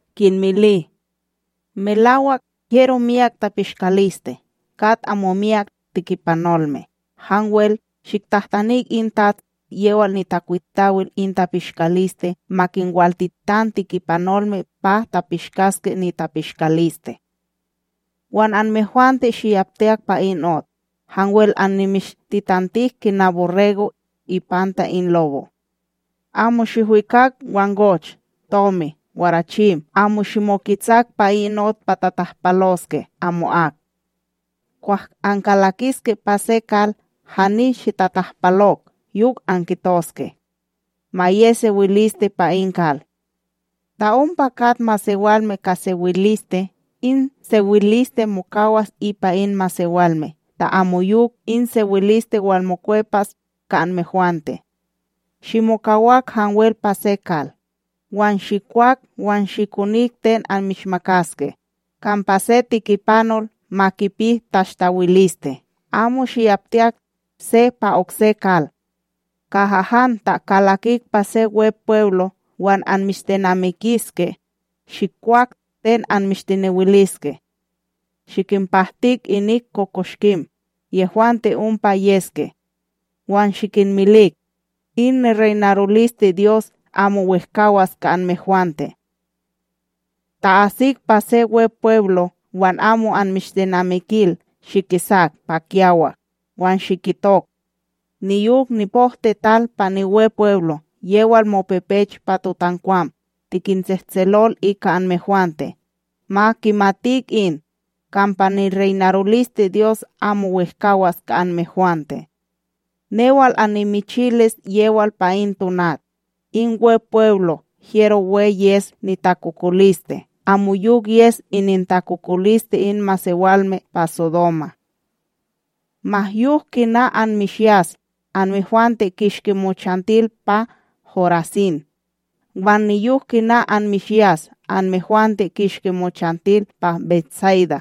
kinmili: ―Melawak, hyero miyak tapishkaliste, kat amo miyak tikipanolme. Hanwel, shiktahtanik in tats yewal nitakwitawil in tapishkaliste ma kinwaltitan tikipanolme pa kipishkaske nitapishkaliste. Wan anmehwante shiyaptiyak pa in ot; hanwel annimishtitantik kina borrego' ipanta in lobo'. Amo shihwikak wangoch, tomi, warachim; amo shimoketsak pa in ot pa tatahpaloske amo'ak. Kwah ankalakiske pa se kal, hani shitatahpalok yok ankitoske: “Ma ye sewiliste pa in kal.” Ta ompa kat masewalme ka sewiliste, in sewiliste mokawas ipa in masewalme, ta amoyok, in sewiliste walmokwepas ka anmehwante. Shimokawak hanwel pa se kal, wan shikwak wan shikonik ten anmishmakaske; kampa se tikipanol ma kipi tahstawiliste. Amo shiyaptiyak se pa okse kal. Kaha han ta kalakik pa se Wepweblo wan anmishtenamikiske, shikwak ten anmishtenewiliske; shikinpahtik inik kokoshkim yehwante ompa yeske, wan shikinmilik: “In nireynarolisteDyos amo wehkawAs ka anmehwante.” Ta asik pa se Wepweblo wan amo anmishtenamikil, shikisak pa kiyawak wan shikitok: “Niyok nipohtiTal pa niWepweblo yewal mopepech pa totankwam, tikintsehtselol ika anmehwante. Ma kimatik in, kampa nireynarolisteDyos amo wehkawAs ka anmehwante.” Newal annimichilis yewal pa in tonat, in Wepweblo hyero we yes nitakokoliste amoyok yes inintakokoliste in masewalme pa Sodoma. ’Ma yok kina anmishyas, anmehwante kishki mochantil pa Horasin! Wan niyok kina anmishyas anmehwante, kishki mochantil pa BetSayda!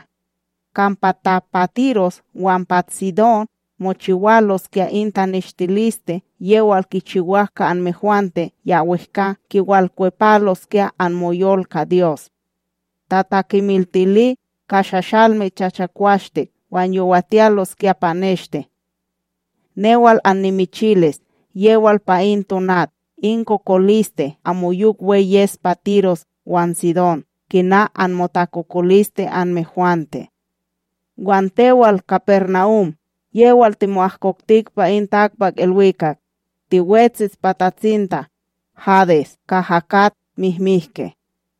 Kampa ta pa Tiros wan pa Tsidón mochiwaloskya in taneshtiliste yewal kichiwak ka anmehwante, ya wehkA kiwalkwepaloskya anmoyol ka Dyos, tatakemiltili ka shashalme chichakwashtik wan yowatiyaloskya pa neshte. Newal annimichilis yewal pa in tonat in takokoliste amoyok we yes pa Tiros wan Tsidon kina anmotakokoliste anmehwante. Wan tewal, KaparNahum, yewal timo'ahkokti pa in takpakIlwikak? Tiwetsis pa tatsinta Hadesa kaha kat mihmihke.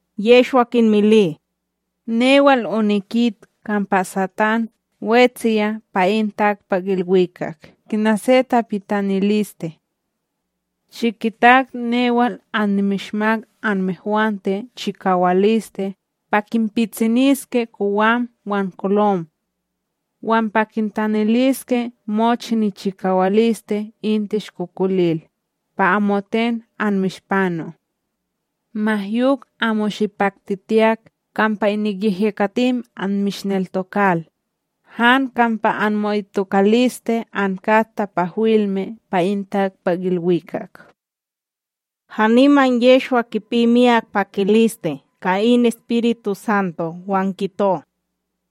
Yehshwa kinmili: ―Newal onikit kampa Satán wetsiya pa in takpakIlwikak kina se tapitaniliste. Shikitak newal annimishmak anmehwante chikawaliste pa kinpitsiniske kowam wan kolom, wan pa kintaniliske mochi nichikawaliste in tishkokolil, pa amoten anmishpano. Ma yok amo shipaktitiyak kampa inik yehyekatim anmishneltokal, han kampa anmo'itokaliste ankat tapahwilme pa in takpakIlwikak. Haniman Yehshwa, kipi miyak pakiliste ka in EspirituSanto, wan kito: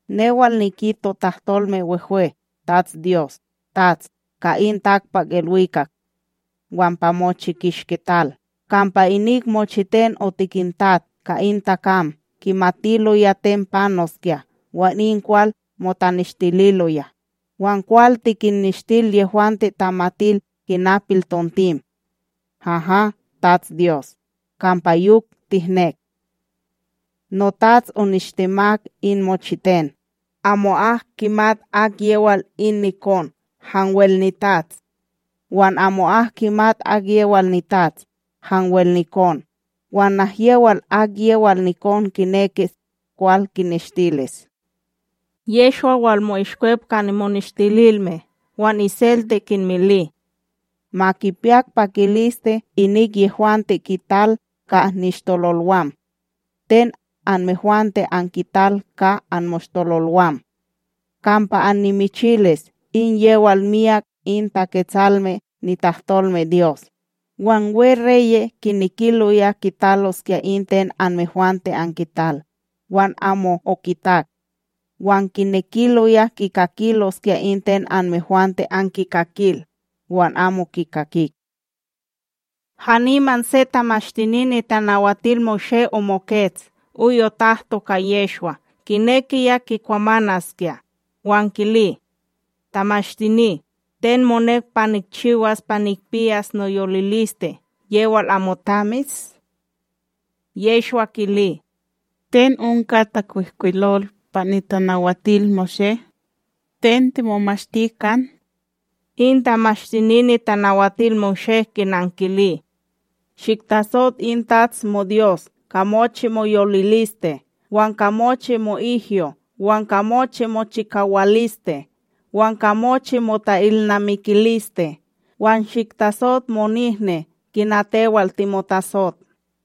―Newal nikito tahtolme wehwe, TatsDyos, TATS ka in takpakIlwikak wan pa mochi kishki tal, kampa inik mochiten otikintat ka in takam kimatiloya ten panoskya wan in kwal motaneshtililoya, wan kwal tikinnishtil yehwante tamatil kina piltontim. Haha, TatsDyos, kampa yok tihnek. ’NoTats onishtemak in mochiten, amo'ak kimat akyewal in nikon, hanwel niTats, wan amo'ak kimat akyewal niTats, hanwel nikon, wan nahyewal akyewal nikon kinekis kwal kineshtilis. Yehshwa walmo'ishkwep ka nimoneshtililme wan iselte kinmili: ―Ma kipiyak pakiliste inik yehwante kital ka nishtololwam ten anmehwante ankital ka anmoshtololwam; kampa annimichilis in yewal myak in Taketsalme nitahtolmeDyos wan weReye' kinekiloya kitaloskya in ten anmehwante ankital, wan amo okitak; wan kinekiloya kikakiloskya in ten anmehwante ankikakil, wan amo kikakik. Haniman se Tamashtini NitanawatilMoshé omokets oy otahto ka Yehshwa kinekiya kikwamanaskya, wan kili: ―Tamashtini, ten monek pa nikchiwas pa nikpiyas noyoliliste yewal amoTamis? Yehshwa kili: ―Ten onka takwihkwilol pa NitanawatilMoshé? Ten timomashti kan? In Tamashtini NitanawatilMoshé kinankili: ―“Shiktasot in TATS moDyos ka mochi moyoliliste, wan ka mochi mo'ihyo, wan ka mochi mochikawaliste wan ka mochi mota'ilnamikiliste; wan shiktasot monihni kina tewal timotasot.”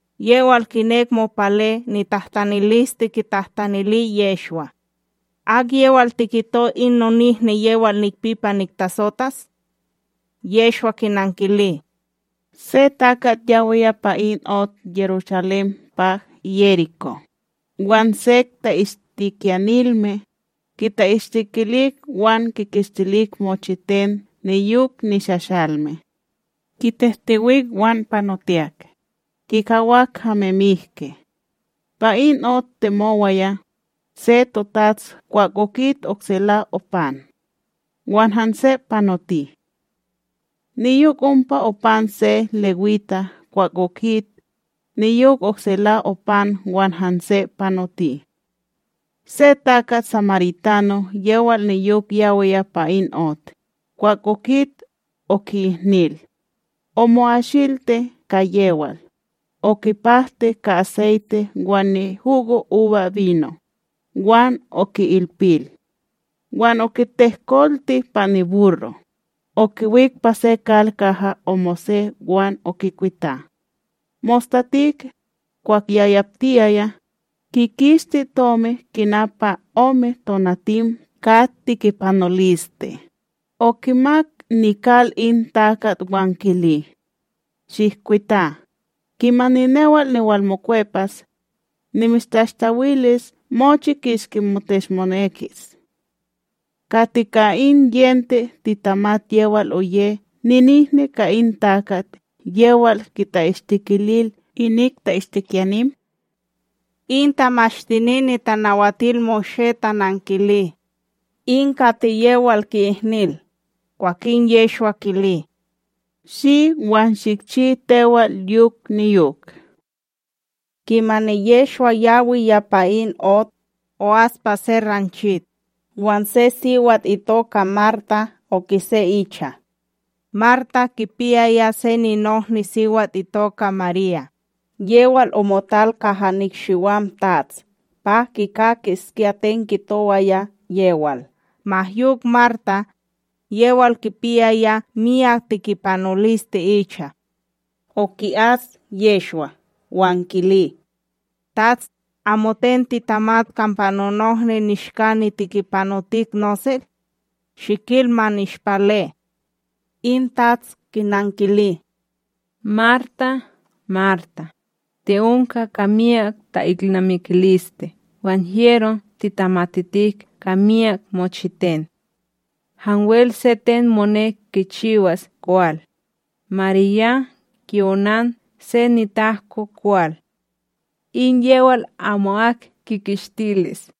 Yewal kinek mopale nitahtaniliste kitahtanili Yehshwa: ―Akyewal tikito in nonihni yewal nikpi pa niktasotas? Yehshwa kinankili: ―Se takat yawiya pa in ot Yerushalém pa Yerikó, wan sek ta'ishtikiyanilme, kita'ishtikilik wan kikishtilik mochiten niyok nishashalme; kitehtewik wan panotiyak, kikawak hame mihki. Pa in ot temowaya, se totats kwah okit oksela opan; wan hanse panoti. Niyok ompa opan se lewita kwah okit, niyok oksela opan wan hanse panoti. Se takat samaritano yewal niyok yawiya pa in ot, kwah okit, oki'ihnil. Omo'ashilti ka yewal, okipahti ka aseyte wan nihugoUbaBino, wan oki'ilpil. Wan okitehkolti pa niburro, okiwik pa se kal kaha omose wan okikwita. Mostatik, kwah yayaptiyaya, kikishti tomi kina pa ome tonatim ka tikipanoliste, okimak nikal in takat wan kili: “Shihkwita, kimani newal niwalmokwepas, nimishtashtawilis mochi kishki mishteshmonekis.” Kati ka in yente titamat yewal oye ninihni ka in takat yewal kita'ishtikilil inik ta'ishtikyanim? In Tamashtini NitanawatilMoshé tanankili: ―In kati yewal ki'ihnil. Kwankin Yehshwa kili: ―Shi, wan shikchi tewal yok niyok. Kimani Yehshwa yawaya pa in ot o'as pa se ranchit, wan se siwat itoka Marta okise icha. Marta kipiyaya se ninohniSiwat itoka Marya, yewal omotal kaha nikshiwam TATS pa kikakiskya ten kitowaya yewal. Ma yok Marta, yewal kipiyaya myak tikipanoliste icha, oki'as Yehshwa wan kili: ―TATS, amoten titamat kampa nonohni nishka nitikipanotik nosel? Shikil, ma nishpale. In TATS kinankili: ―Marta, Marta, ti'onka ka myak ta'ilnamikiliste wan hyero titamatitik ka myak mochiten, hanwel se ten monek kichiwas kwal. Marya ki'onan se nitahko kwal, in yewal amo'ak kikishtilis.